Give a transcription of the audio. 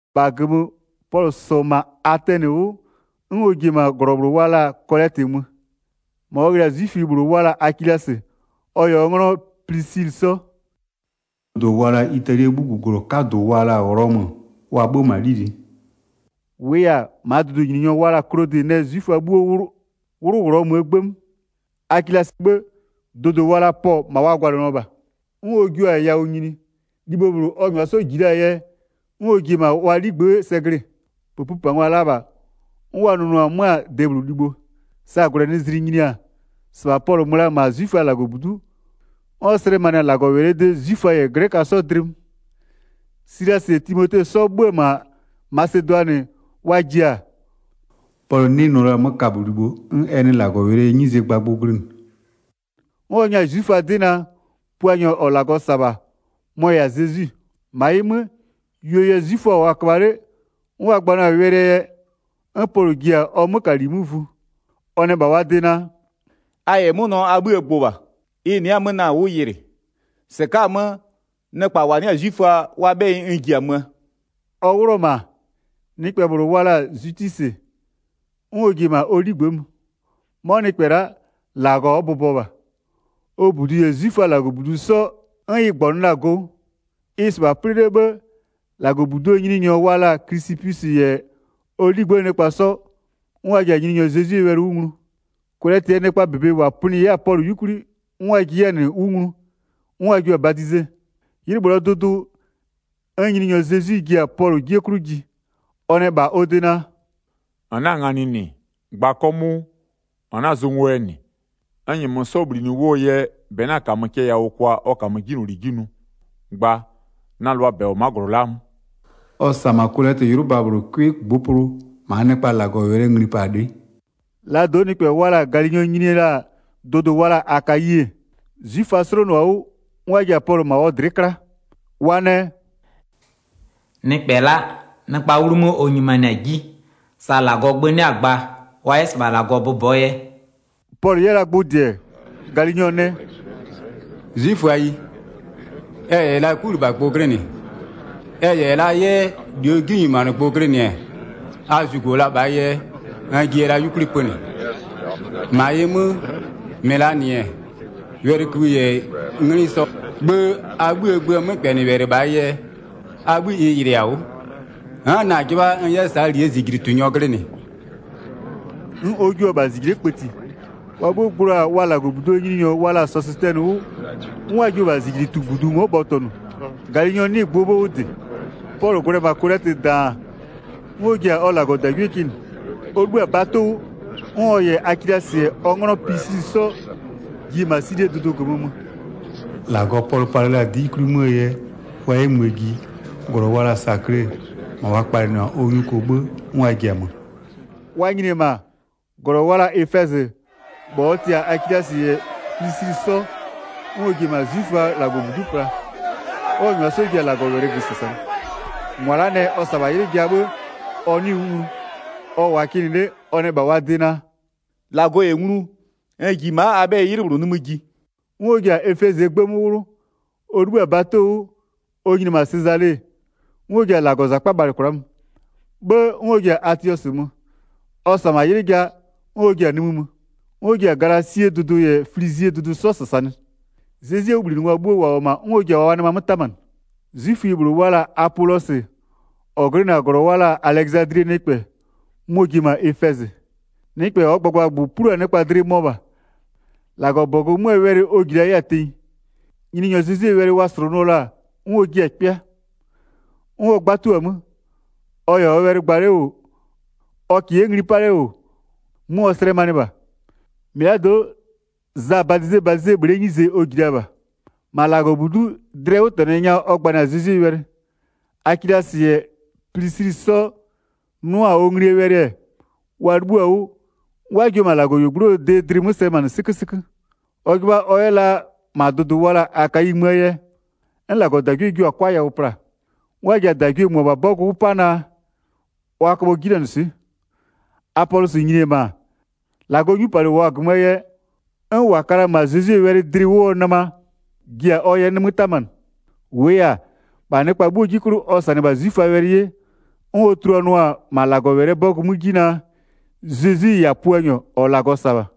1-Bha -gömö, Pɔlʋ -sɔ-ɔ -ma Atɛnɩ 'wʋ, 'n ɔ ji-e -ma -glɔ wa la-a Kolɛtɩ mö. 2-Ma ɔ ghlɩ-a 'zwiföyi -bhlʋ wa la-a Akilasɩ, ɔ -yɛ ɔ 'nglɔ Plisilɩ 'sɔ. Dʋdʋ wa la-a Italie 'bhuguglɔ 'kadʋ wa la-a Ghlɔmö, wa 'bhö-ö -ma 'lili'i. -Wʋʋ yɛ-a, -maa dʋdʋnyininyɔ wa la-a Klodɩ nɛ 'zwiföa 'bhuo 'wlʋ Ghlɔmöö 'gbë 'mö. Akilasɩɛ 'bhë, dʋdʋ wa la-a Pɔɔ -ma wa gwalɩnɩɔ -bha. 'N Pɔlʋ jua-a yawʋ nyini. Libho -bhlʋ ɔ -nyʋa 'sɔ -ji la-aa yɛ, 'n ɔ ji-e -ma wa 'ligbë'ë sɛ glɩ-ɩ. -Pëpïpangwa la -bha, 'n wa nʋnʋɔ 'mö-a debhlʋ libho. Sa -gwlɛnɩzlɩ nyini-a, -sɩbha Pɔlʋ mö la-a -ma 'zwiföaa -Lagɔbudu'u, 'n ɔ slɛmanɩ-a -Lagɔwɛlɩɛ de 'zwiföa -yɛ glɛköa 'sɔ dlɩ 'mö. Silasɩ -yɛ Timote 'sɔ 'bhö-ö 'mö-a Masedʋanɩ wa ji-a, Pɔlʋ 'nɩ nʋ la-a 'mö kabölibho 'n ɛ nɩ -Lagɔwɛlɩɛ 'nyizee gbagbʋ glɩnɩ. 'N ɔ nyɛ-a 'zwiföa 'dɩ naa, Puanyɔ -ɔ -Lagɔ -sa-a -bha mɔ-ɔ -yɛ-a Zezwi. 6-Ma ɩ 'mö, yuo yɛ 'zwiföa -wʋɔ-a köbha 'le 'n wa gbanɩɔ-a wɛlɩɛ yɛ-ɛ, 'n Pɔlʋ ji-a ɔ 'mökali 'mö vu. Ɔ nɛ -bha wa de naa: “A -yɛ 'mʋnɔ a 'bhïë gbʋ -bha. Ɩ nɩ'ɩ-a 'mö na-a 'wʋ yɩlɩ. -Sɩka'a-a 'mö, nɩkpa -wa 'nɩ-a 'zwiföa wa 'bhɛyɩ n ji-a möö.” Ɔ 'wlʋ-ɔ -ma, nɩkpɛ -bhlʋ wa la-a Zwitwisɩ, 'n ɔ ji-e -ma ɔ 'ligbë'ë mö. 'Mɔ nɩkpɛ la'a, -Lagɔ ɔ bʋbɔ -bha. Ɔ -budu -yɛ 'zwiföaa -Lagɔbudu 'sɔ 'n ɩ -gbɔnʋ la-a go 'wʋ. Ɩ-ɩ -sɩbha 'plɩ 'le 'bhë-ë, -Lagɔbuduo nyininyɔ wa la-a Klisɩpwisɩ -yɛ ɔ 'ligbë'ëë nɩkpa 'sɔ, 'n wa ji-a Nyininyɔ Zezwie wɛlɩ 'wʋ nglu, Kolɛtɩɛ nɩkpaa -bebe -wa pönɩ 'yɛ-a Pɔlʋ 'yukwli 'n wa jiɩ 'yɛ-a -nɩ 'wʋ nglu, 'n wa jua-a badize. 'Ylɩ -bhlʋɔ dʋdʋ, 'n Nyininyɔ Zezwi ji-a Pɔlʋ 'jie 'klʋ ji, ɔ nɛ -bha ɔ de naa: “-N 'na-a nganɩ -nɩ, gba 'kɔmʋʋ, -n 'na-a zʋ ngo yɛ -nɩ. N -nyɛmö 'sɔ -bhlinɩ 'wʋɔ yɛ -bɛ 'na -kamö cɛ yawʋ kwa ɔ -kamö 'jinyloli 'ji nʋ. Gba, na -lʋaa -bɛ -wʋ-ɔ ma'a -glɔ la'aa 'mö.” Ɔ -sa -ma Kolɛtɩ 'ylʋba -bhlʋ 'cʋɩ -ngbʋpʋlʋ, -maa nɩkpaa -Lagɔwɛlɩɛ nglipalɩ'ɩ. Laa do'o nɩkpɛ wa la-a Galinyɔ nyini la-a dʋdʋ wa la-a Akayi-e, 'zwiföa 'slonʋ-a 'wʋ, 'n wa ji-a Pɔlʋ -ma ɔ dlɩ'ɩ 'kla. Wa nɛ: “Nɩkpɛ la'a, nɩkpaa 'wlumö ɔ nyimanɩ-a 'ji, sa -Lagɔɔ gbö 'nɩ-a gba wa 'yɛ -sɩbha -Lagɔ bʋbɔɔ yɛ.” Pɔlʋ 'yɛ la gbʋ -dɩɛ mö, Galinyɔ nɛ: “'Zwiföayi, ɛ -yɛ la 'kulɩbhagbʋ glɩnɩ, ɛ -yɛ la 'yɛ -luo 'jinyimanɩgbʋ glɩnɩ-ɛ, a zugo la -bhaa yɛ n jiya la 'yukwli pönɩ. 15-Ma ɩ 'mö, -mɩ -laa -nɩ-ɛ, wɛlɩkïbhï -yɛ 'nglɩ 'sɔ, 'bhë a 'bhïë gböö 'mökpɛnɩwɛlɩ -bhaa yɛ, a 'bhï ɩ yɩlɩ-a 'wʋ. N'n na-a 'jɩbha n 'yɛ -saa -lie -zijlitunyɔ glɩnɩ.” 'N ɔ jua-a -bha -zijle'e kpëti. Wa 'bhuo gblo-a wa -Lagɔbuduo nyininyɔ wa la-a Sɔsɩtɛnɩ 'wʋ, 'n wa jio-o -bha -zijlitubudu ngo'o bhɔtɔnʋ, Galinyɔ 'nɩɩ-ɩ gbʋɔ 'bhë 'wʋ -dɩ. Pɔlʋ gwlɛ-ɛ -ma Kolɛtɩ -daan, 'n ɔ ji-a ɔ -Lagɔdagwie kɩnɩ. Ɔ 'libhï-a bato 'wʋ, 'n ɔ -yɛ Akilasɩ -yɛ ɔ 'nglɔ Plisilɩ 'sɔ ji-e -ma Silie dʋdʋ -gömö mö. -Lagɔ Pɔlʋ palɩ la-a 'dɩ 'yukwli 'möö yɛ, wa 'yɛ möö ji, -glɔ wa la-a Sakle -ma wa kpalɩnɩ-a ɔ nyuko 'bhë 'n wa ji-a mö. Wa nyini-e -ma -glɔ wa la-a Efɛzɩ, -bha ɔ tɩ-a Akilasɩ -yɛ Plisilɩ 'sɔ, 'n ɔ ji-e -ma 'zwiföaa -Lagɔbudu'u pla, 'n ɔ -nyʋa 'sɔ ji-a -Lagɔwɛlɩ -gömö -sasanɩ. 20-Mʋa la'a nɛ ɔ -sa-a -bha 'ylɩ ja, 'bhë ɔ 'nɩɩ-ɩ 'wʋ nglu. Ɔ -wʋʋa-a kɩnɩ 'le, ɔ nɛ -bha wa de naa: “-Lagɔ -yɛ nglu, n ji ma'a a 'bhɛyɩ 'ylɩ -bhlʋ nimï ji.” 'N ɔ ji-a Efɛzɩɛ 'gbë 'mö 'wlʋ. Ɔ 'libhï-a bato 'wʋ, ɔ nyini-e -ma Sezale, 'n ɔ ji-a -Lagɔzakpa bhalɩ kwla'a mö. 'Bhë 'n ɔ ji-a Atiɔsɩ mö. Ɔ -sa-a -ma 'ylɩ ja, 'n ɔ ji-a nimï mö. 'N ɔ ji-a Galasie dʋdʋ -yɛ Flizie dʋdʋ 'sɔ -sasanɩ. Zezwie 'wʋbhlinɩngwa bhuo -wa -wʋ-ɔ -ma 'n ɔ ji-a wa nɩma 'mö 'tamanɩ. 'Zwiföyi -bhlʋ wa la-a Apolɔsɩ, -ɔ glɩnɩ-a -glɔ wa la-a Alɛzadlie nɩkpɛ, mɔ-ɔ ji-e -ma Efɛzɩ. Nɩkpɛ -ɔɔ gbagbagbʋ plu-a nɩkpa dlɩ mɔ -bha, -Lagɔbɔgʋ 'möö wɛlɩ ɔ -ji la 'yɛ-a tenyi. Nyininyɔ Zezwie wɛlɩ wa -slʋnʋɔ la-a 'n ɔ jiɩ-a 'kpɩa. 'N ɔ 'gbatuo-a 'mö. Ɔ -yɛ ɔ wɛlɩ gba 'le -wʋ, ɔ -kɩɩ 'yɛ ngli 'pa 'le -wʋ, 'mö ɔ slɛmanɩɩ -bha. -Mɩlado'o, Zaa badizebadize bhle'ee 'nyize ɔ -ji la -bha. 26-Ma -Lagɔbudu'u dlɩɛ 'wʋtɛnɔ nya ɔ gbanɩ-a Zezwie wɛlɩ. Akilasɩ -yɛ Plisilɩ 'sɔ 'nʋ-a ɔ nglie wɛlɩ, wa 'libhïɔ-a 'wʋ, 'n wa jio-a -Lagɔyuogblʋɔ de dlɩ 'mö slɛmanɩ 'sɩkösɩkö. Ɔ 'jɩbha ɔ 'yɛ la -ma dʋdʋ wa la-a Akayi möö yɛ, 'n -Lagɔdagwie jio-a 'kwa yawʋ pla-a. 'N wa ji-a -dagwie -mʋabha 'bɔgʋ 'wʋ 'pa naa, wa köbhɔ 'jinanɩswɩ'ɩ. Apolɔsɩ nyini-e -ma, -Lagɔɔ 'nyupalɩ -wʋɔ-a -gömöö yɛ, 'n -wa ka la-a -ma Zezwie wɛlɩ dlɩ 'wʋɔ nɩma ji-a ɔ yɛ 'mö 'tamanɩ. 28-Wʋʋ yɛ-a, -bha nɩkpa 'bhuo 'ji 'klʋ ɔ -sanɩ-ɛ -bha 'zwiföaa wɛlɩ 'ye, 'n ɔ tuluanʋa-a -ma -Lagɔwɛlɩɛ 'bɔgʋ 'mö 'ji naa, Zezwi-i -yɛ-a Puanyɔ -ɔ -Lagɔ -sa-a -bha.